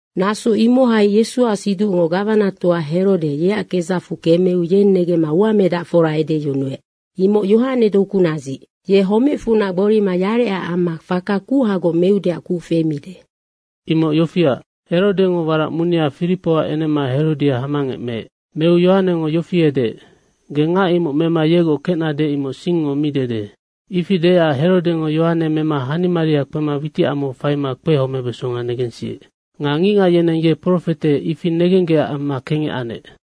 Naso imohai Yesuac siducngo gawanatoa Herode yeac kedzacfu kemeu yeng negemma uamedacfora edeyunuec, “Imoc Yohane dokunadzic. Ye homecfunac gborima yarecac amma faka kuhagoc meudeac kuc femide.” Imoc yofiac, Herodengo warac munea Firipoac enema Herodia hamangec meec. Meu Yohanengo yofi edeec, “Ge ngac imoc mema yegoc kecnade, imoc singngo mi dede.” Ifi deecac Herodengo Yohane mema hanimaria kpema witicamau faima kpehomebeso negensiec. Nga ngicngac yeneng ye profete, ifi negenggecac amma kengec anec.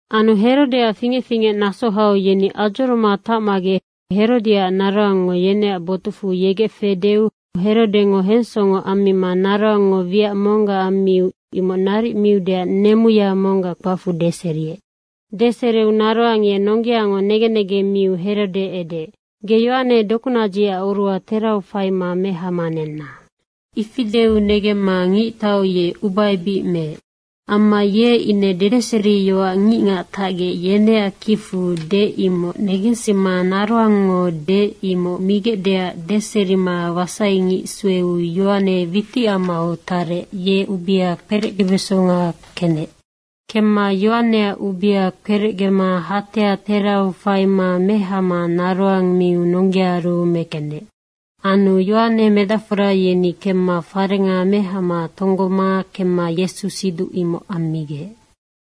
Anu Herodeac fingec fingecnaso hau yeni adzoroma tacmagec Herodiaac naroangngo yeneac botucfu yegec fedeu Herodengo hensongo ammima naroangngo wiac monggac ammiu imoc naric miudeac nemuya monggac kpacfu deseriec. Deseriu naroang ye nonggeango negen negeng miu Herode edeec, “Ge Yohane dokunadzicac oruha terau faima mehama nenna.” Ifi deu negemma ngictau ye ubaebic meec. Amma ye ine dedeseriyoac ngicngac tacgec yeneac kicfu deec, imoc negensima naroangngo deec, imoc migecdeac deserima wasaingic sueu Yohane witicamau tarec, ye ubea herecgebesonga kenec. Kemma Yohaneac ubea kperecgema hatea terau faima mehama naroang miu nonggeaaru mekenec. Anu Yohane medacfora yeni kemma farenga mehama tonggoma kemma Yesu siduc imoc ammigec.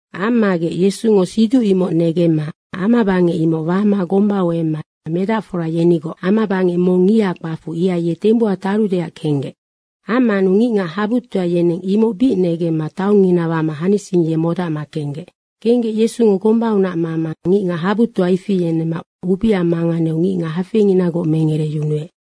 Ammagec Yesungo siduc imoc negemma amabangec imoc wama gombau emma medacfora yenigoc amabangec mong ngiha kpacfu, ihai ye tembuha tarudeac kenggec. Ammanu ngicngac habutoa yeneng imoc bic negemma taongngina wama hanising ye modacma kenggec. Kenggec Yesungo gombaunac mama ngicngac habutoa ifi yenemma ubea manganeu ngicngac hafeinginagoc mengereyunuec.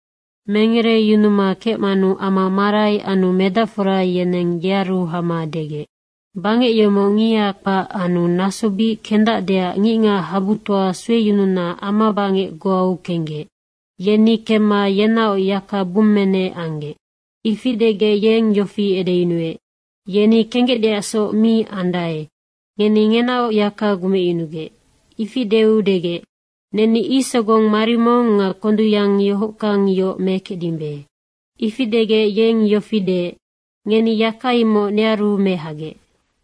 Mengereyunuma kecmanu ama marai anu medacfora yeneng yearu hama degec, “Bangec yomoc ngiha kpac anu naso bic kendacdeac ngicngac habutoa sueyununa amabangec goau kenggec. Yeni kemma yenaoc yaka bummenec anggec.” Ifi degec yeng yofi edeyunuec, “Yeni kenggecdeacsoc mi ande, ngeni ngenaoc yaka gumecyunugec.” Ifi deu degec, “Neni ic sogong marimong nga kondungyang yohockang yoc mekecdimbe.” Ifi degec yeng yofi deec, “Ngeni yaka imoc nearu mehagec.”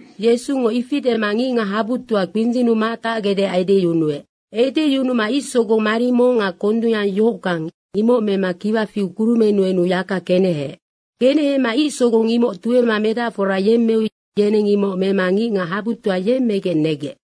Yesungo ifi dema ngicngac habutoa kpindzinnu matacgecdeac edeyunuec. Edeyunuma ic sogong marimong nga kondungyang yohockang, imoc mema kiwa fiu kurumennu enu yaka keneheec. Kenehema ic sogong imoc tuema medacfora yemmeu yeneng imoc mema ngicngac habutoa yemmegec negec.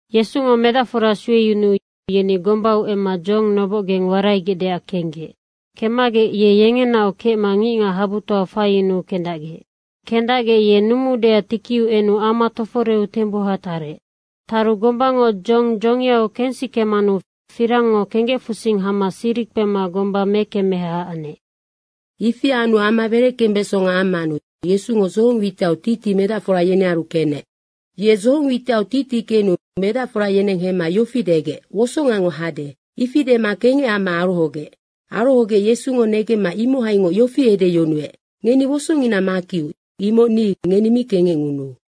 Yesungo medacfora sueyunuu yeni gombau emma dzohong nobocgeng waraigecdeac kenggec. Kemmagec ye yengenaoc kecma ngicngac habutoa faiyunuu kendacgec. Kendacgec ye numuudeac tikiu enu ama toforeu tembuha tarec. Taru gombango dzohong dzongiau kensikemanu firangngo kenggecfusing hama siri kpema gomba mekemmeha anec. Ifi anu ama wereckembesonga ammanu Yesungo dzohong witiau titi medacfora yenearu kenec. Ye dzohong witiau titikenu medacfora yeneng hemma yofi degec, “Wosongango hade.” Ifi dema kengec amma arohogec. Arohogec Yesungo negemma imohaingoc yofi edeyunuec, “Ngeni wosongina makiu, imoc ni, ngeni mi kengecngunuu.”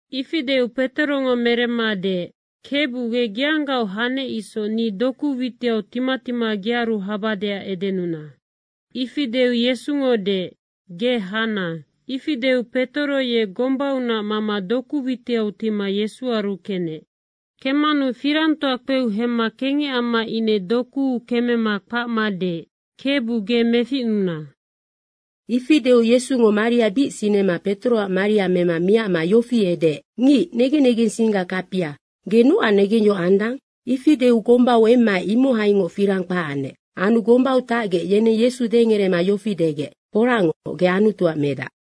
Ifi deu Petorongo meremma deec, “Kebu, ge geanggaoc hanec isoc, ni doku witiau tima tima gearu habadeac edenuna.” Ifi deu Yesungo deec, “Ge hana.” Ifi deu Petoro ye gombaunac mama doku witiau tima Yesuaru kenec. Kemmanu firangtoa kpeu hemma kengec amma ine dokuu kemema kpacma deec, “Kebu, ge meficnuna.” Ifi deu Yesungo maria bic sinema Petoroac mari mema miacma yofi edeec, “Ngic negen negensingga kapia, ge nocac negengyohoc andang?” Ifi deu gombau emmaec imohaingoc firang kpac anec. Anu gombau tacgec, yeneng Yesu dengerema yofi degec, “Foracngoc, ge Anutuac Medac.”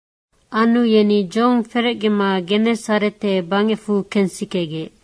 Anu yeni dzohong ferecgema Genesarete bangecfu kensikegec.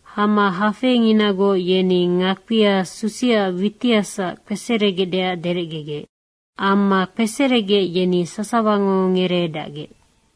Hama hafeinginagoc yeni ngakpia susiaac witihasac kpeseregecdeac derecgegec. Amma kpeseregec, yeni sasawango ngereedacgec.